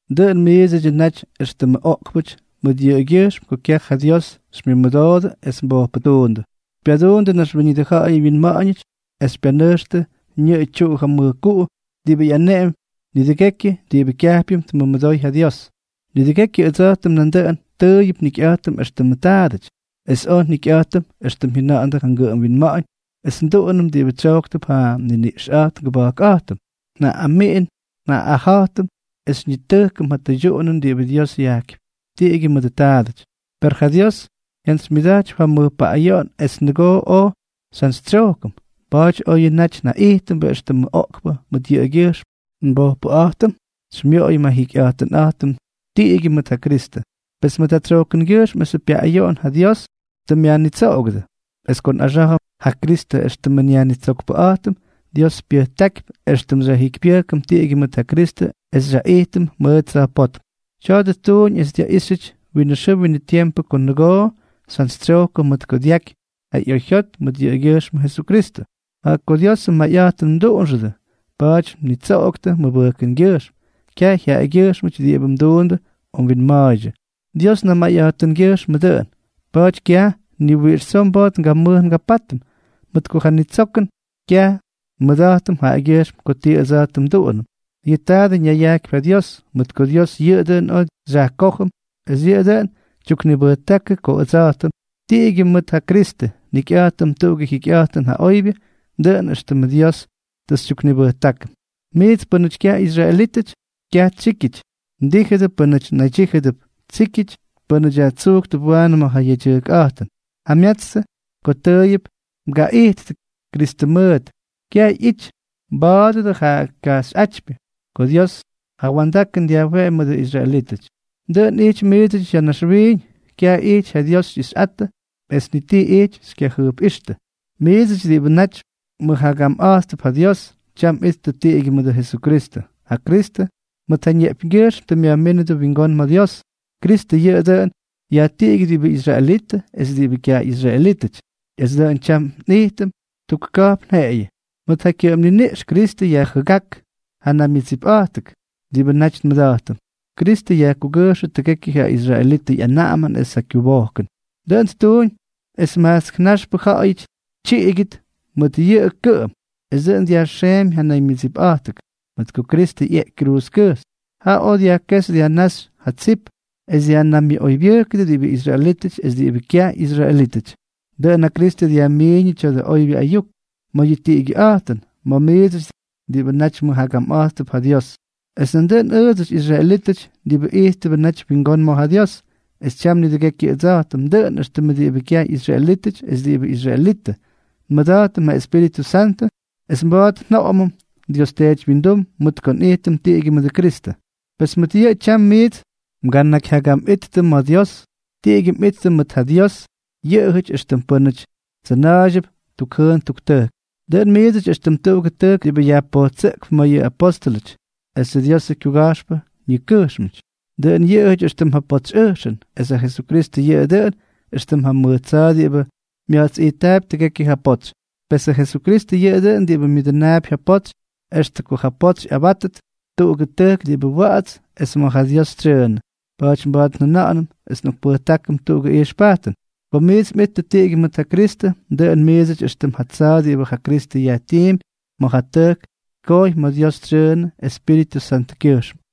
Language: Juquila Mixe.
Dʉꞌʉn miidsʉdyʉ naty éxtʉmʉ oꞌkpʉty mʉt yʉꞌʉgyʉjxm ko kyaj ja Dios xymyʉmʉdoodʉ es mbojpʉtuundʉ, xypyaduundʉ naxwíñʉdʉ ja̱ꞌa̱yʉ wyinma̱ꞌa̱ñʉty es xypyanʉjxtʉ ñʉꞌʉ tyuꞌu ja mʉjkuꞌu diꞌibʉ ꞌyaneꞌempy nidʉgekyʉ diꞌibʉ kyajpyʉm tmʉmʉdoy ja Dios. Nidʉgekyʉ ʉdsa̱jtʉm nandʉꞌʉn tʉʉyʉp njikyꞌa̱jtʉm éxtʉmʉ taadʉty, es oj njikyꞌa̱jtʉm extʉm jyʉnandʉ ja ngʉꞌʉm winma̱ꞌa̱ñ es nduꞌunʉm diꞌibʉ tsyojktʉp ja nniniꞌxꞌa̱jt ngʉba̱jkꞌa̱jtʉm. Njaꞌꞌamiꞌin njaꞌꞌaja̱jtʉm es xyñitʉjkʉm yʉ tʉydyuꞌunʉn diꞌibʉ Dios yajkypy, tiꞌigyʉ mʉdʉ taadʉty. Per ja Dios jyantsymyʉda̱jtypy ja mʉj paꞌꞌayoꞌon es nʉgoo oj xyjantsytsyojkʉm, pa̱a̱ty, oyʉ naty njaꞌijtʉmbʉ éxtʉmʉ oꞌkpʉ mʉt yʉꞌʉgyʉjxmʉ nbojpʉꞌa̱jtʉm, xymyoꞌoyʉm ja njikyꞌa̱jtʉnꞌa̱jtʉm tiꞌigyʉ mʉt ja Kristʉ. Pes mʉt ja tsyojkʉngyʉjxm esʉ pyaꞌꞌayoꞌon ja Dios tʉ myajnitsoꞌogʉdʉ. Es ko nꞌaxá̱jʉm ja Kristʉ éxtʉmʉ nYajnitsokpʉꞌa̱jtʉm, Dios pyʉjtákypy éxtʉm xyajjikypyʉjkʉm tiꞌigyʉ mʉt ja Kristʉ es xyaꞌijtʉm mʉʉt tsa̱jpótm. Tya̱a̱dʉ ttuuñ es dyaꞌíxyʉty winʉ xʉʉ winʉ tiempʉ ko nʉgoo xyjantsytsyojkʉm mʉt ko dyaky ja ꞌyoyjyot mʉt yʉꞌʉgyʉjxmʉ Jesukristʉ. Jaꞌa ko Dios mayꞌa̱jtʉn mduꞌunxʉdʉ, pa̱a̱ty mnitsoꞌoktʉ mʉbʉjkʉngyʉjxm, kyaj jaꞌagyʉjxm diꞌibʉ mduundʉ o mwinma̱a̱ydyʉ, Dios namayꞌa̱jtʉngyʉjxmʉꞌʉ dʉꞌʉn. Pa̱a̱ty kyaj ni wiꞌix tsoo mba̱a̱t ngamʉj ngapátʉm, mʉt ko ja nitsokʉn kyaj nmʉda̱jtʉm jaꞌagyʉjxm ko tii ʉdsa̱jtʉm nduꞌunʉm, yʉꞌʉ taadʉ ñayajkypy ja Dios. Mʉt ko Dios yʉꞌʉ dʉꞌʉn oj xyajkójʉm es yʉꞌʉ dʉꞌʉn tyuknibʉjtákʉ ko ʉdsa̱jtʉm, tiꞌigyʉ mʉt ja Kristʉ, njikyꞌa̱jtʉm tuꞌugʉ jikyꞌa̱jtʉn ja oybyʉ, dʉꞌʉn éxtʉmʉ Dios tʉ xytyuknibʉjtákʉm. Miits pʉ́nʉty kyaj ꞌyisraelítʉty, “kyaj tsíkyʉty” mdíjʉdʉ pʉ́nʉty naydyíjʉdʉp “tsíkyʉty”, pʉ́nʉty yajtsujktʉp waanʉ ma̱ ja yedyʉjkꞌa̱jtʉn. Jamyatstʉ ko tʉʉyʉp mgaꞌijttʉ Kristʉ mʉʉt, kyaj ꞌyity mba̱a̱dʉdʉ ja kajxyꞌátypyʉ ko Dios ja wa̱ndakʉn dyajweꞌemy mʉdʉ israelítʉty. Dʉꞌʉn ijty miidsʉty ya̱ naxwiiñ, kyaj ijty ja Dios xyꞌixyꞌattʉ es ni ti ijty xykyajʉjpꞌíxtʉ. Miidsʉty diꞌibʉ naty mʉjagamꞌa̱jttʉp ja Dios, tyam mꞌittʉ tiꞌigyʉ mʉdʉ Jesukristʉ; ja Kristʉ, mʉt ja ñeꞌpyñgyʉjxm tʉ myajmínʉdʉ wingón ma̱ Dios. Kristʉ yʉꞌʉ dʉꞌʉn yajtiꞌigyʉ diꞌibʉ israelitʉ es diꞌibʉ kyaj ꞌyisraelítʉty, es dʉꞌʉn tyam nꞌijtʉm tuk ka̱jpn jeꞌeyʉ. Mʉt ja kyʉꞌʉm niniꞌx Kristʉ yajjʉgák ja naymyʉdsipꞌa̱jtʉk diꞌibʉ naty nmʉda̱jtʉm. Kristʉ yajkugʉjxʉ tʉgekyʉ ja israelitʉ ꞌyanaꞌamʉn es ja kyubojkʉn. Dʉꞌʉn ttuuñ es ja majtsk naxpʉ ja̱ꞌa̱yʉty tyiꞌigʉt mʉt yʉꞌʉ kʉꞌʉm, es dʉꞌʉn dyajxeemy ja naymyʉdsipꞌa̱jtʉk. Mʉt ko Kristʉ ꞌyeꞌky kruuzkʉjxy, jaꞌa oj dyajkéxy dyajnáxy ja tsip, es dyajnaymyʉꞌoybyʉjkʉdʉ diꞌibʉ israelítʉty es diꞌibʉ kyaj ꞌyisraelítʉty. Dʉꞌʉn ja Kristʉ dyajmiiñʉ tya̱dʉ oybyʉ ayuk ma̱ yʉ tiꞌigyʉꞌa̱jtʉn ma̱ miidsʉty diꞌibʉ naty mʉjagamꞌa̱jttʉp ja Dios, es nandʉꞌʉn ʉʉdsʉty, israelítʉty diꞌibʉ ijttʉbʉ naty wingón ma̱ ja Dios. Es tyam nidʉgekyʉ ʉdsa̱jtʉm, dʉꞌʉn éxtʉm diꞌibʉ kyaj ꞌyisraelítʉty es diꞌibʉ israelitʉ, nmʉda̱jtʉm ja Espíritʉ Santʉ es mba̱a̱t njoꞌomʉm Dios Teety wyindum mʉt ko nꞌijtʉm tiꞌigyʉ mʉdʉ Kristʉ. Pes mʉt yʉꞌʉ tyam miits mganakyjyagamꞌittʉ ma̱ Dios, tiꞌigyʉ mꞌittʉ mʉt ja Diosʉ jyaꞌayʉty éxtʉm pʉ́nʉty tsʉna̱a̱ydyʉp tuk jʉʉn tuk tʉjk. Dʉꞌʉn miidsʉty éxtʉm tuꞌugʉ tʉjk diꞌibʉ yajpojtsʉꞌkp ma̱ yʉ apóstʉlʉty esʉ Diosʉ kyuga̱jxpʉ ñikʉjxmʉty, dʉꞌʉn yʉꞌʉjʉty éxtʉm ja potsyꞌʉjxʉn, es ja Jesukristʉ yʉꞌʉ dʉꞌʉn éxtʉm ja mʉj tsa̱a̱ diꞌibʉ mya̱jtsꞌijttaapy tʉgekyʉ ja potsy. Pesʉ Jesukristʉ yʉꞌʉ dʉꞌʉn diꞌibʉ myʉdʉnaapy ja potsy extʉ ko ja potsy ꞌyabátʉt tuꞌugʉ tʉjk diꞌibʉ wa̱ꞌa̱ts es ma̱ ja Dios tsyʉʉnʉ. Pa̱a̱ty mba̱a̱t njʉna̱ꞌa̱nʉm es nꞌokpʉjtákʉm tuꞌugʉ ijxpajtʉn. Ko miits mꞌittʉ tiꞌigyʉ mʉt ja Kristʉ, dʉꞌʉn miidsʉty éxtʉm ja tsa̱a̱ diꞌibʉ ja Kristʉ yajtiimpy ma̱ ja tʉjk tkojy ma̱ Dios tsyʉʉnʉ Espíritʉ Santʉkyʉjxm.